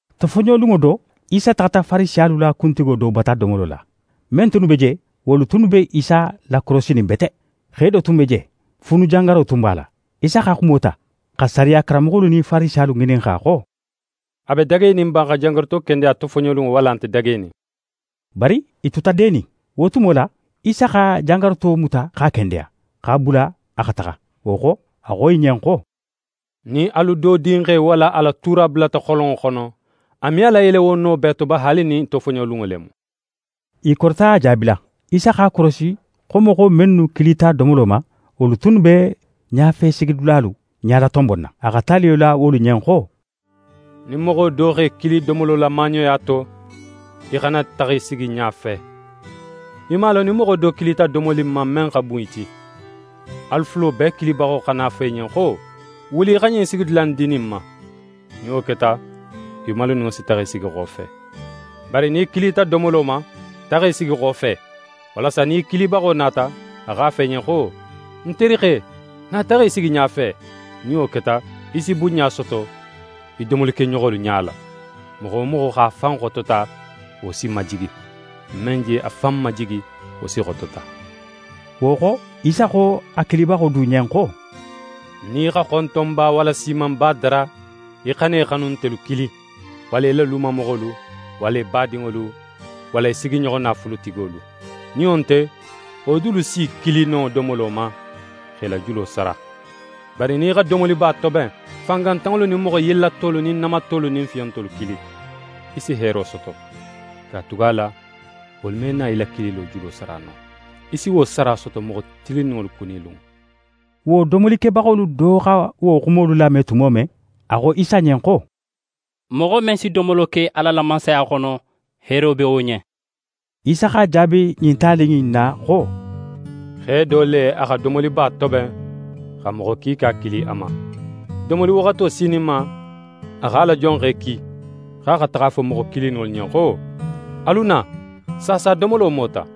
Tofoɲolunŋo do, Isa taxata Farisiyalu la kuntigo do bata domolo la. Men tunnu be je, wolu tunnu be Isa lakorosinin bete. Xe do tun be je, fuunujangaro tun b'a la. Isa xa xumo ta, xa sariya karanmoxolu nin Farisiyalu ŋininxa xo: «A be dagenin ba xa jangaruto kendeya tofoɲolunŋo, walla a nte dagenin?» Bari i tuta denin. Wo tumo la, Isa xa jangaruto muta x'a kendeya, x'a bula a xa taxa. Wo xo, a xo i ɲen xo: «Nin alu do dinxe walla a la tuura bulata xolonŋo xono, a me a layele wo no bee to ba, haali nin tofoɲolunŋo le mu?» I korita a jaabila. Isa x'a korosi xo moxo mennu kilita domolo ma, wolu tunnu be ɲafesigidulalu ɲalatonbonna. A xa taliyo la wolu ɲen xo: «Nin moxo do x'é kili domolo la maaɲoya to, í xana taxa í sigi ɲafe. Í man a lon nin moxo do kilita domoli in ma, men xa bun í ti; alu fulo bee kilibaxo xana na a fo í ɲen xo: “Wuli, í xa ɲin sigidula in di ɲin ma.” Nin wo keta, í maluninŋo si taxa í sigi xofe. Bari nin í kilita domolo ma, taxa í sigi xofe, walasa nin í kilibaxo nata, a x'a fo í ɲen xo: “Ń terixe, na taxa í sigi ɲafe.” Nin wo keta, í si bunɲa soto í domolikeɲoxolu ɲala. Moxo wo moxo x'a fan xotota, wo si majigi, men je a fan majigi, wo si xotota.» Wo xo, Isa xo a kilibaxo du ɲen xo: «Nin í xa xontonba walla siimanba dara, í xana í xanuntelu kili, walla í la lumamoxolu walla í badinŋolu, walla í sigiɲoxo naafulutigolu. Nin wo nte, wo dulu si í kili no domolo ma, x'é la julo sara. Bari nin í xa domoliba toben, fangantanŋolu nin moxo yellatolu nin namatolu nin fiyontolu kili. Í si heero soto, katugala wolu me na í la kililo julo sara no. Í si wo sara soto moxo tilinninŋolu kunilunŋo.» Wo domolikebaxolu do xa wo xumolu lame tumo men, a xo Isa ɲen xo: «Moxo men si domolo ke Ala la Mansaya xono, heero be wo ɲen.» Isa x'a jaabi ɲin tali in na xo: «Xe do le, a xa domoliba toben, xa moxo kiika kili a ma. Domoli waxato sininma, a x'a la jonxe ki, xo a xa taxa a fo moxo kilininŋolu ɲen xo: “Alu na, saasa domolo mota.”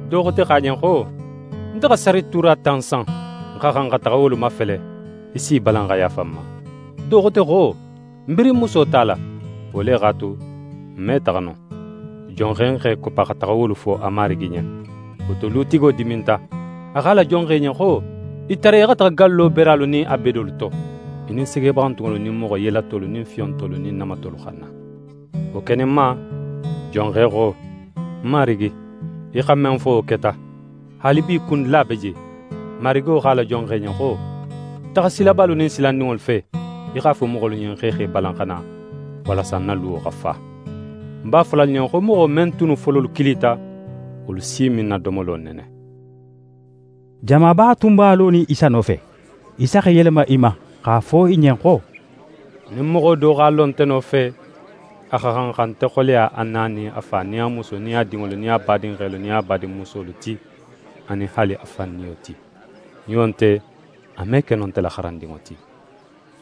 Do xote xo a ɲen xo: “Nte xa sarituura tan san, ń xa xan xa taxa wolu mafele; í s'í balan xa yaafa ń ma.” Do xote xo: “Ń birin muso tala. Wo le x'a tu, ń me taxa no.” Jonxe x'é koppa xa taxa wolu fo a marigi ɲen. Wo to, lutigo diminta. A xo a la jonxe ɲen xo: “Í tariya í xa taxa gallo beralu nin a bedolu to, í nin segebaxantunŋolu nin moxo yellatolu nin fiyontolu nin namatolu xa na.” Wo keninma, jonxe xo: “Ń marigi, í xa men fo, wo keta. Haalibi, kundula be je.” Marigo xo a la jonxe ɲen xo: “Taxa silabalu nin silandinŋolu fe, í x'a fo moxolu ɲen xo i x'e balan xa na, walasa ń na luwo xa fa. Ń b'a fola alu ɲen xo moxo men tunnu fololu kilita, wolu si me ń na domolo nene.”» Jamaba tun b'a lonin Isa nofe. Isa x'é yelema i ma, x'a fo i ɲen xo: «Nin moxo do x'a lo nte nofe, a xa xan xa nte xoleya a na nin a fa nin a musu nin a dinŋolu nin a badinxelu nin a badinmusolu ti, anin haali a fan niyo ti. Nin wo nte, a me ke no nte la xarandinŋo ti.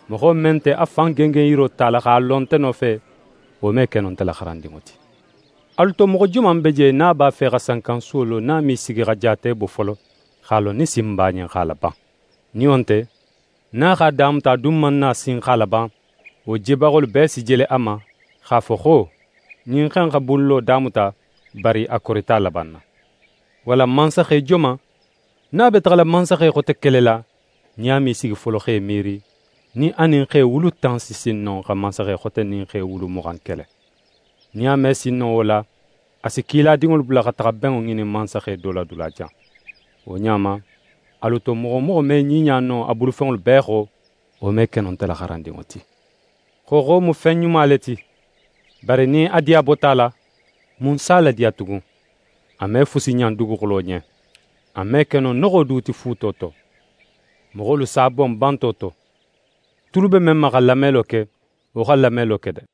Moxo men nte a fan gengenyiro tala, x'a lo nte nofe, wo me ke no nte la xarandinŋo ti. Alu to, moxo joman be je, nin a b'a fe xa sankansuwo lo, nin a me sigi xa jaate bo folo, x'a lon nin sin b'a ɲen x'a laban? Nin wo nte, nin a x'a damuta, a dun man na sin x'a laban, wo jebaxolu bee si jele a ma, x'a fo xo: “Ɲin xe in xa bunlo damuta, bari a korita a labanna.” Walla mansaxe joman, nin a be taxala mansaxe xote kelela, nin a me í sigi folo x'é miiri, nin a nin xe wulu tan si sin no xa mansaxe xote nin xe wulu muxan kele? Nin a me sin no wo la, a si kiladinŋolu bula xa taxa benŋo ŋinin mansaxe do la dulajan. Wo ɲa ma, alu to moxo wo moxo me ɲiɲa no a bulufenŋolu bee xo, wo me ke no nte la xarandinŋo ti.» «Xooxo mu fen ɲuma le ti, bari nin a diya bota a la, mun s'a ladiya tugun? A me fusi ɲan duguxulo ɲen. A me ke no noxo du ti fuuto to. Moxolu s'a bon banto to. Tulu be men ma xa lamelo ke, wo xa lamelo ke de!»